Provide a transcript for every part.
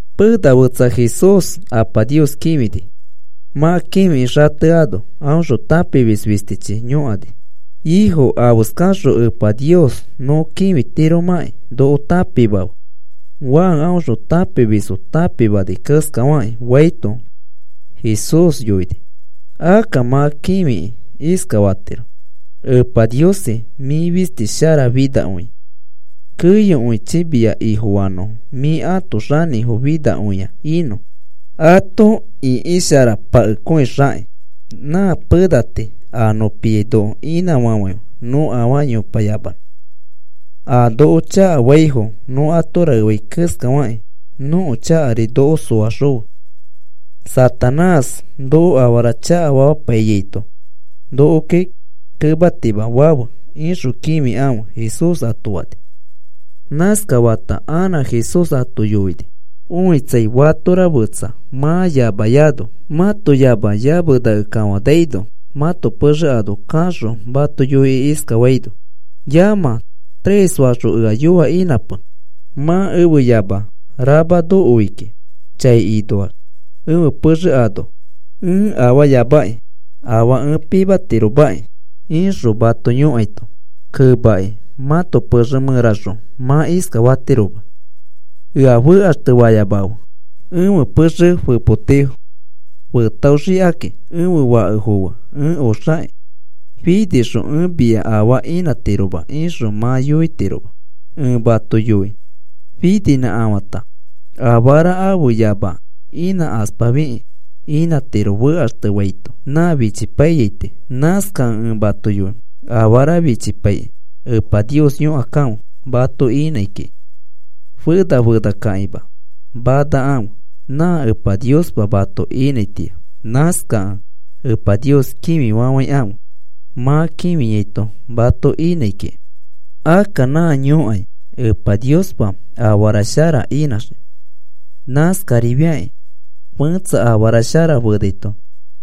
Pena fetsa Jesús Apa Nios kĩfini. Mã kĩfikĩ xateano aõxõ tãpimis fistichi yõkani: “Ifo, afeskaxõ Epa Nios nõ kĩfitiromakĩ noko tãpimafe, Juan aõxõ tãpimisfo tãpimani keskafakĩ,” faito, Jesús yoini: “Akka mã kĩfikĩ iskafatiro: Epa Niosi, mĩ fisti sharafinakõia. Keyokõichi mia Ifofanõfo mĩ ãto xanĩfo finakõia inõ ato ĩkisharakõipakexakĩ. Nã pena tii a nõ piai noko inãfafãife nõ afaa yopayamanõ. A noko chakafaifo nõ ato raefa keskafakĩ nõko chakari noko soaxõfe. Satanás noko afara chakafamapaifiaito nokoki kematimafafe, ixõ kĩfikãfe,” Jesús ato fani. Nãskafata anã Jesús ato yoini: “Õitsai, fatora mã fetsa mã yamayano, mato yama yamenakẽ kafanaino mãto pexe ano kaxõ mato yoikĩ iskafaino: ‘Yamã, tres faxõ ea yoa inãpe. Mã ẽfe yama rama noi kiki chai inoax ẽfe pexe ano, ẽ afaayamaki afaa ẽ pimatiromaki,’ ixõ mato yõkaito, kemakĩ mãto pexe mẽraxõ mã iskafatiroma: ‘Ea fekaxtefayamafe. Ẽfe pexe fepoti fetaoxikakĩ ẽfe fakefo fe ẽ oxaki. Finixõ ẽ mia afaa inãtiroma,’ ixõ mã yoitiroma. Ẽ mato yoi, fininãkafã afara ãfe yama inãkaspafikĩ inãtiro fekaxtefaito nã fichipaiyai tii. “Nãskakẽ ẽ mato yoi, afara fichipaikĩ Epa Nios yõkakãfe mato inãi kiki. Fena fenakãkĩma manakãfe nã Epa Niospa mato inãitĩa. Nãskakẽ Epa Nios kĩfifafãikãfe mã kĩfiaito mato inãi kiki. Akka nã yõkai Epa Niospa afara shara inãxii. Nãskarifiakĩ fẽtsa afara shara fenaito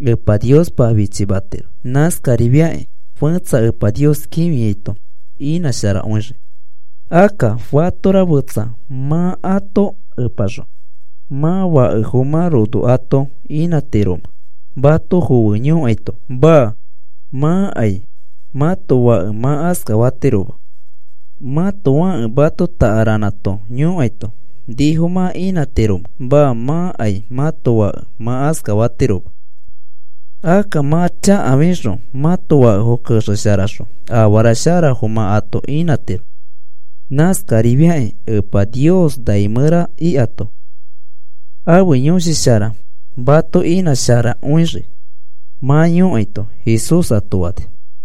Epa Niospa fichimatiro. Nãskarifiakĩ fẽtsa Epa Nios kĩfiaito inãsharakõixii. “Akka, ¿fatora fẽtsa mã ãto epaxõ mãto fakefo mã rono ato inãtiromẽ mato foe yõkaito? Maa. Mãkai mãto fake mã askafatiroma. Mãto fake mato takaranã too yõkaito, ¿nifo mã inãtiromẽ? Maa. Mãkai mãto fake mã askafatiroma. Akka, mã chakafixõ mãto fakefo kexesharaxõ afara sharafo mã ato inãtiro. Nãskarifiakĩ Epa Nios nai mẽra ikato ãfe Yõshi Shara mato inãsharakõixii mã yõkaito,” Jesús ato fani.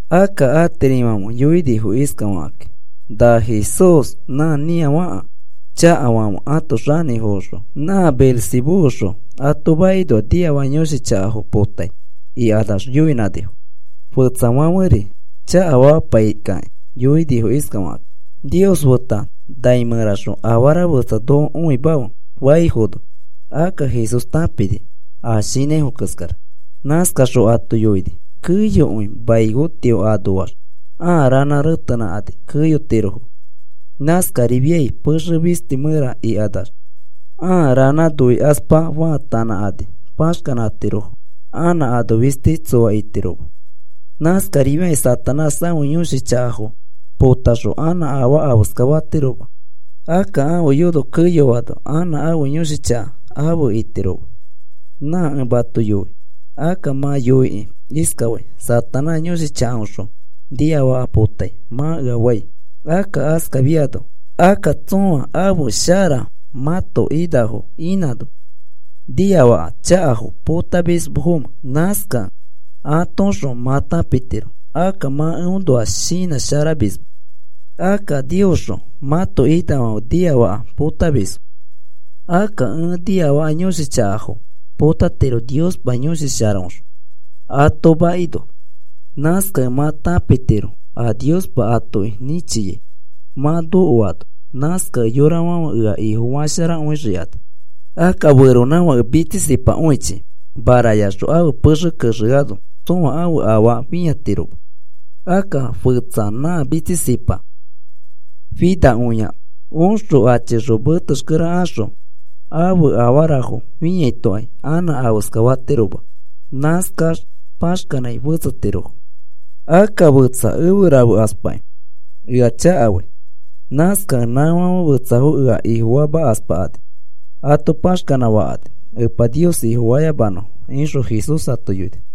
Akka atirifãfe yoinifo iskafakakĩ: “Na Jesús nã niafaka chakafãfe ãto xanĩfoõxõ nã Beelzebúxõ ato makinoa niafaka yõshi chakafo potai,” ikanax yoinãnifo. Fetsafãferi chakafamapai kakĩ yoinifo iskafakakĩ: “Nios feta nai mẽraxõ afara fetsafo noko õimafe,” faifono, akka Jesús tãpini a shinãifo keskara. Nãskaxõ ato yoini: “Keyokõi mai tio anoax ãa ranã retenãkani keyotirofo. Nãskarifiai pexe fisti mẽra ikanax ãa ranã noikaspa faatanãkani paxkanãtirofo anã ano fistikai tsoa itiroma. Nãskarifĩakĩ Satanás ãfe yõshi chakafo potaxõ anã afaa afeskafatiroma. Akka ãfe yono keyoano anã ãfe yõshi chaka afe itiroma. Nã ẽ mato yoi, akka mã yoikĩ iskafai: ‘Satanás yõshi chakaõxõ niafaka potai,’ mã ea fai. Akka askafiano, akka, ¿tsõa ãfe shara mãto inafo inãno niafaka chakafo potamisfomẽ? Nãskakẽ atoõxõ mã tãpitiro akka mã eõnoa shinãsharamisma. Akka Niosxõ mãto inafãfe niafaka potamisfo. Akka ẽ niafaka yõshi chakafo potatiro Niospa Yõshi Sharaõxõ ato makinoa. Nãskakẽ mã tãpitiro a Niospa atoki nĩchiai mã nokoano. Nãskakẽ yorafãfe ea Ifofasharakõixikani. “Akka feronãfake mitsisipakõichi marayaxõ ãfe pexe kexekõiano tsõa ãfe afaa fĩatiroma. Akka fetsa nã mitsisipa finakõia oxõ achixõ metexkere axõ ãfe afarafo fĩaitokai anã afeskafatiroma. Nãskax paxkanãi fetsetirofo. “Akka fetsa efe rafekaspakĩ ea chakafai. Nãskakẽ nãfãfe fetsafo ea Ifofamakaspakani ato paxkanã fakani Epa Nios Ifofayamanõfo,” ixõ Jesús ato yoini.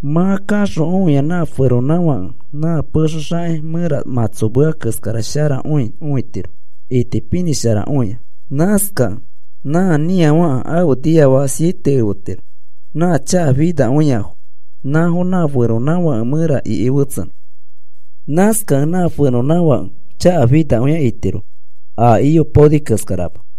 Mã kaxõ õia nã feronãfake nã pexe xaki mẽra mãtsomea keskara sharakõi õitiro itipinĩsharakõia. Nãskakẽ nã nĩafaka afe niafaka siete efetiro nã chakafinakõiafo, nãfo nã feronãfake mẽra iki fetsenõ. Nãskakẽ nã feronãfake chakafinakõia itiro a iyopaoni keskarama.”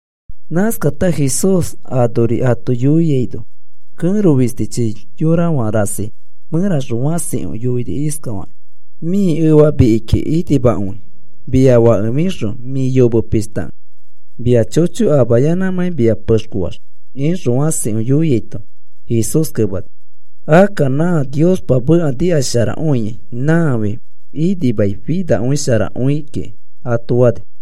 Nãskata Jesús anori ato yoiaino kẽro fistichi yorafã rasi mẽraxõ fãsikõi yoini iskafakĩ: “Mĩ efa mikiki inimakõi mia fake fixõ mĩ yome pishtakẽ mia chocho amayanãmãi mia pexkoax,” ixõ fãsikõi yoiaito, Jesús kemani: “Akka nã Niospa meka nikasharakõiai nãfi inimai finasharakõi kiki,” ato fani.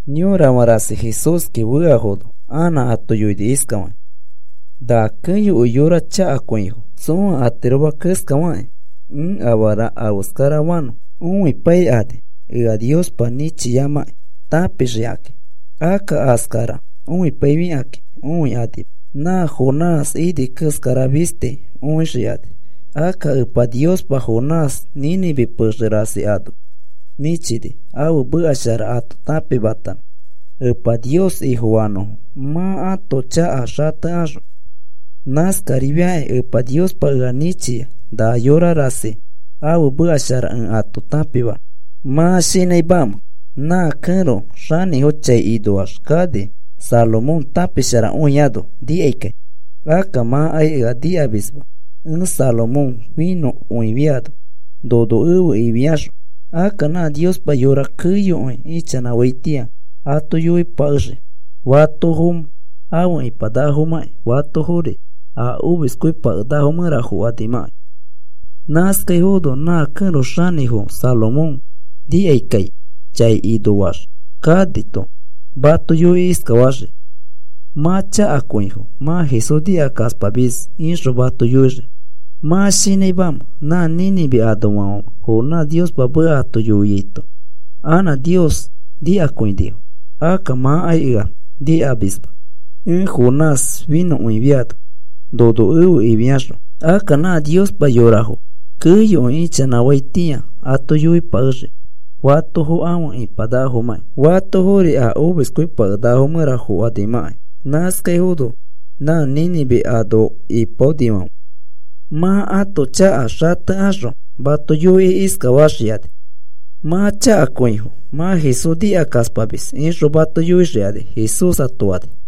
Yorafã rasi Jesúski feafono anã ato yoini iskafakĩ: “Na keyokõi yorafo chakakõifo. Tsõa atiroma keskafakĩ ẽ afara afeskarafanõ õipaikani ea Niospa nĩchiamãkĩ tãpixikakĩ. Akka a keskara õipaifikakĩ õikanima. Nã Jonás ini keskara fisti õixikani. Akka Epa Niospa Jonás Nínive pexe rasi ano nĩchini ãfe meka shara ato tãpimatanõ Epa Nios Ifofanõfo mã ãto chaka xatekaxõ. Nãskarifiakĩ Epa Niospa ea nĩchia na yorafã rasi ãfe meka shara ẽ ato tãpimanõ. ¿Mã shinãimamẽ nã kẽro xanĩfo chai inoax kani Salomón tãpisharakõiano nikaikai? Akka mãkai ea nikamisma ẽ Salomón finõkõifiano nono efe ifiaxõ. Akka nã Niospa yorafo keyokõi ichanãfaitĩa ato yoipakexii fatofo afe ipanakafomakĩ, fatofori a omiskõipakenakafo mẽra fokanimãkai. Nãskaifono nã kẽro xanĩfo Salomón nikaikai chai inoax kanito mato yoikĩ iskafaxii: ‘Mã chakakõifo mã Jesús nikakaspamis,’ ixõ mato yoixii. ¿Mã shinãimamẽ nã Nínive anoafãfe Jonás Niospa meka ato yoiaito anã Nios nikakõinifo? Akka mãkai ea nikamisma ẽ Jonás finõkõifiano nono efe ifiaxõ. Akka nã Niospa yorafo keyokõi ichanãfaitĩa ato yoipakexii fatofo afe ipanakafomãkĩ, fatofori a omiskõipakenakafo mẽra fokanimãkai. Nãskaifono nã Nínive ano ipaonifãfe mã ãto chaka xatekaxõ mato yoikĩ iskafaxikani: ‘Mã chakakõifo mã Jesús nikakaspamis,’ ixõ mato yoixikani,” Jesús ato fani.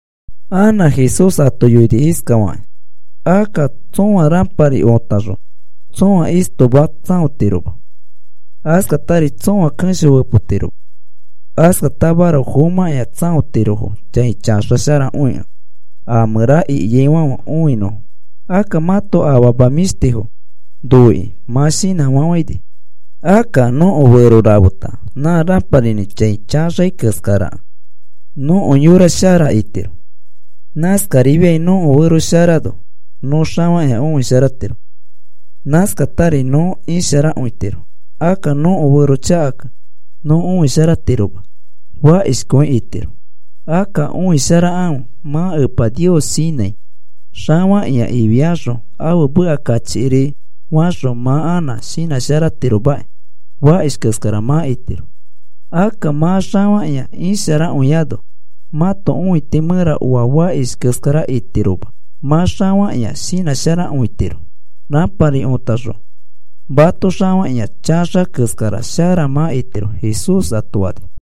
Anã Jesús ato yoini iskafakĩ: “Akka tsõa rãpari otaxõ tsõa istoma tsãotiroma. Askatari tsõa kesho fepotiroma. Askatamaroko fomãkĩa tsãotirofo chai chaxasharakõikẽ a mẽra ikiaifãfe õinõfo. Akka mãto afama mĩshtifo noikĩ mã shinãfafãini. Akka nõko fero rafeta nã rãparinĩ chai chaxai keskarakẽ, nõko yora shara itiro. Nãskarifiai nõko fero sharano nõ xafakĩa õisharatiro. Nãskatari nõ isharakõitiro. Akka nõko fero chakakẽ nõ õisharatiroma, fakishkõi itiro. Akka õisharakãfe mã Epa Nios shinãi xafakĩa ifiaxõ ãfe meka kachikiri faxõ mã anã shinãsharatiromaki, fakish keskara mã itiro. Akka mã xafakĩa isharakõiano, mãto õiti mẽra oa fakish keskara itiroma. Mã xafakĩa shinãsharakõitiro rãpari otaxõ mato xafakĩa chaxa keskara shara mã itiro,” Jesús ato fani.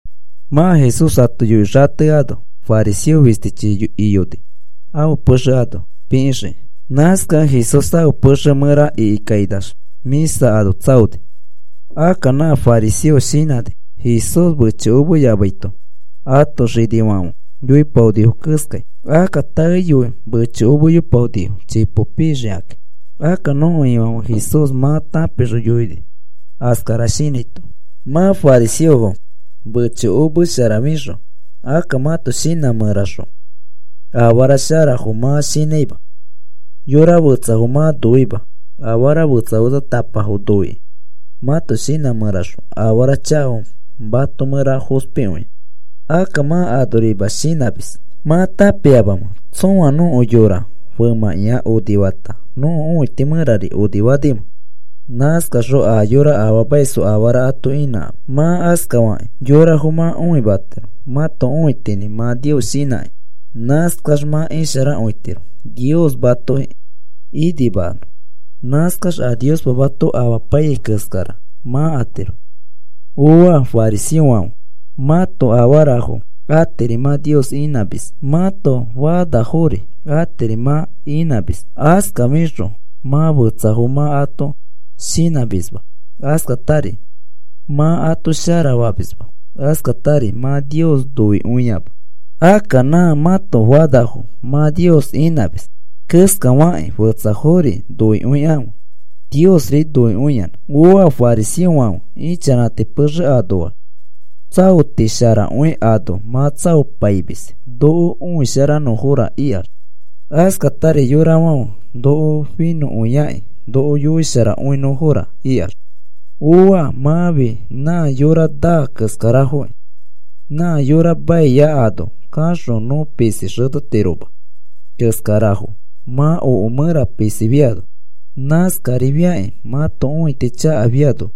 Mã Jesús ato yoikĩ xateano fariseo fistichi iyoni ãfe pexe ano pikĩxikĩ. Nãskakẽ Jesús ãfe pexe mẽra ikikainax mĩsa ano tsaoni. Akka nã fariseo shinãni Jesús mechokomeyamaito ãto xinifãfe yoipaonifo keskai. Akka taeyoi mechokomepaonifo, chipo pixikakĩ. Akka nõko Ifãfe Jesús mã tãpixõ yoini askara shinãito: “Mã fariseofo mechokomesharafixõ, akka mãto shinã mẽraxõ afara sharafo mã shinãima. Yora fetsafo mã noima, afara fetsa fetsatapafo noikĩ mãto shinã mẽraxõ afara chakafo mato mẽra fospikõia. Akka mã anorima shinãmis. ¿Mã tãpiamamẽ tsõa nõko yora femãkĩa onifata, nõko õiti mẽrari onifanimẽ? Nãskaxõ a yora afaamaisfo afara ato inãkãfe. Mã askafakĩ yorafo mã õimatiro mãto õitinĩ mã Nios shinãkĩ. Nãskax mã isharakõitiro, Nios matoki inimanõ. Nãskaxõ a Niospa mato amapaiyai keskara mã atiro. “¡Ooa, fariseofãfe! Mãto afarafo atiri mã Nios inãmis. Mãto fanafori atiri mã inãmis. Askafixõ mã fetsafo mã ato shinãmisma, askatari mã ato sharafamisma. Askatari mã Nios noikõiama. Akka nã mãto fanafo mã Nios inãmis keskafakĩ fetsafori noikõikãfe Niosri noikõiyanã. “¡Ooa, fariseofãfe! Ichanãti pexe anoax tsaoti sharakõi ano mã tsaopaimis noko õisharanõfora ikax. Askatari yorafãfe noko finõkakĩ noko yoikõisharanõfora ikax. “¡Ooa! Mãfi nã yora naa keskarafokĩ. Nã yora maia ano kaxõ nõ pisi xetetiroma keskarafo mã oke mẽra pisifiano. Nãskarifiakĩ mãto õiti chakafiano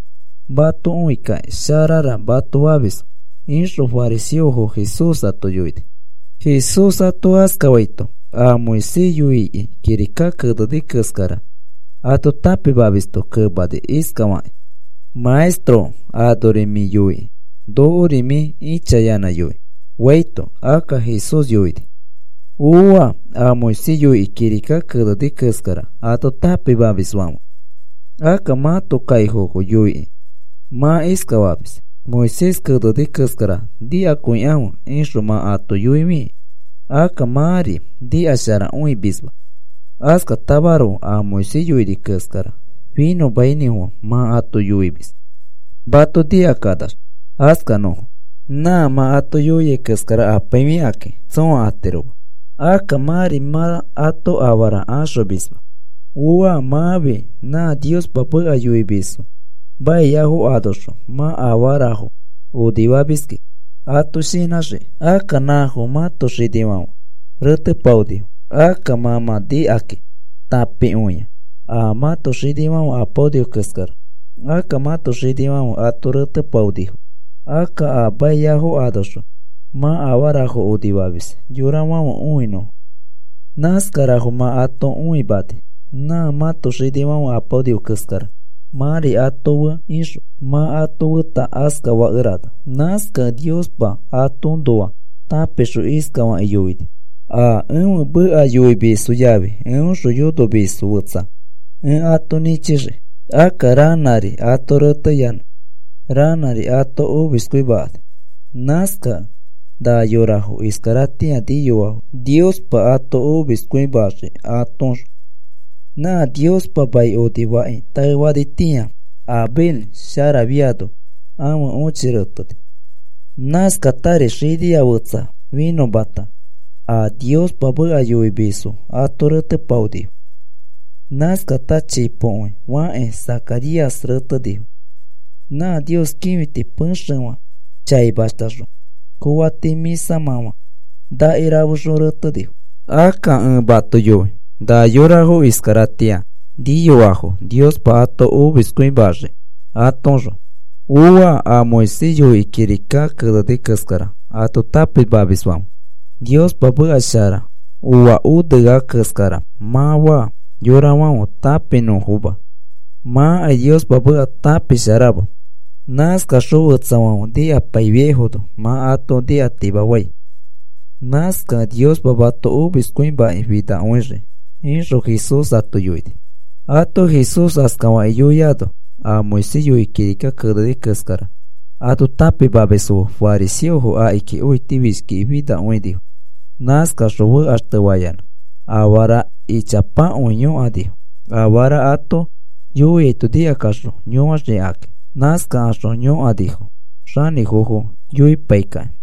mato õikakĩ sharara mato famisfo,” ixõ fariseofo Jesús yoini. Jesús ato askafaito, a Moisés yoikĩ kirika keneni keskara ato tãpimamisto kemani iskafakĩ: “Maestro, anori mĩ yoikĩ nokori mĩ ĩchayanã yoi,” faito, akka Jesús yoini: “¡Ooa a Moisés yoikĩ kirika keneni keskara ato tãpimamisfãfe! Akka mãto kaifofo yoikĩ mã iskafamis: ‘Moisés keneni keskara nikakõikãfe,’ ixõ mã ato yoifikĩ akka mãri nikasharakõimisma. Askatamaroko a Moisés yoini keskara finõmainĩfofã mã ato yoimis mato nikakanax askanõfo. Nã mã ato yoiai keskara apaifikakĩ tsõa atiroma. Akka mãri mã ato afaa axomisma. “¡Ooa! Mãfi nã Niospa meka yoimisfo maiafo anoxõ mã afarafo onifamiski ato shinãxikĩ. Akka nãfo mãto xinifãfe retepaonifo. Akka mã mã nikakĩ tãpikõia a mãto xinifãfe apaonifo keskara. Akka mãto xinifãfe ato retepaonifo. Akka a maiafo anoxõ mã afarafo onifamis yorafãfe õinõfo. Nãskarafo mã ato õimani nã mãto xinifãfe apaonifo keskara, mãri ato fe ixõ mã ato feta askafakerana. “Nãskakẽ Niospa atoõnoa tãpixõ iskafakĩ yoini: ‘A ẽfe meka yoimisfo yafi eõxõ yonomisfo fetsa ẽ ato nĩchixii. Akka ranãri ato reteyanã ranãri ato omiskõimakani.’ Nãskakẽ na yorafo iskaratĩa niyoafo Niospa ato omiskõimaxii atoõxõ. Nã Niospa mai onifaki taefanitĩa Abel sharafiano ãfe õchi reteni. Nãskatari xinia fetsa finõmata a Niospa meka yoimisfo ato retepaonifo. Nãskata chipokõi fakakĩ Zacaríasri retenifo. Nã Nios kĩfiti pexefã chaimashtaxõ koati mĩsamãfã nakirafexõ retenifo. Akka ẽ mato yoi na yorafo iskaratĩa niyoafo Niospa ato omiskõimaxii atoõxõ. “¡Ooa a Moisés yoikĩ kirika keneni keskara ato tãpimamisfãfe! Niospa meka shara oa onea keskara mã faa yorafãfe tãpinõfoma. Mãkai Niospa meka tãpisharama. Nãskaxõ fetsafãfe nikapaifiaifono mã ato nikatimafai. Nãskakẽ Niospa mato omiskõimakĩ finakõixii,” ixõ Jesús ato yoini. Ato Jesús askafakĩ yoiaino, a Moisés yoikĩ kirika keneni keskara ato tãpimamisfo fe fariseofo akiki õitifishkiki finakõinifo. Nãskakaxõ fekaxtefayanã afara ichapakõi yõkanifo, afara ato yoiaito nikakaxõ yõaxikakĩ. Nãskakaxõ yõkanifo xanĩfofo yoipaikakĩ.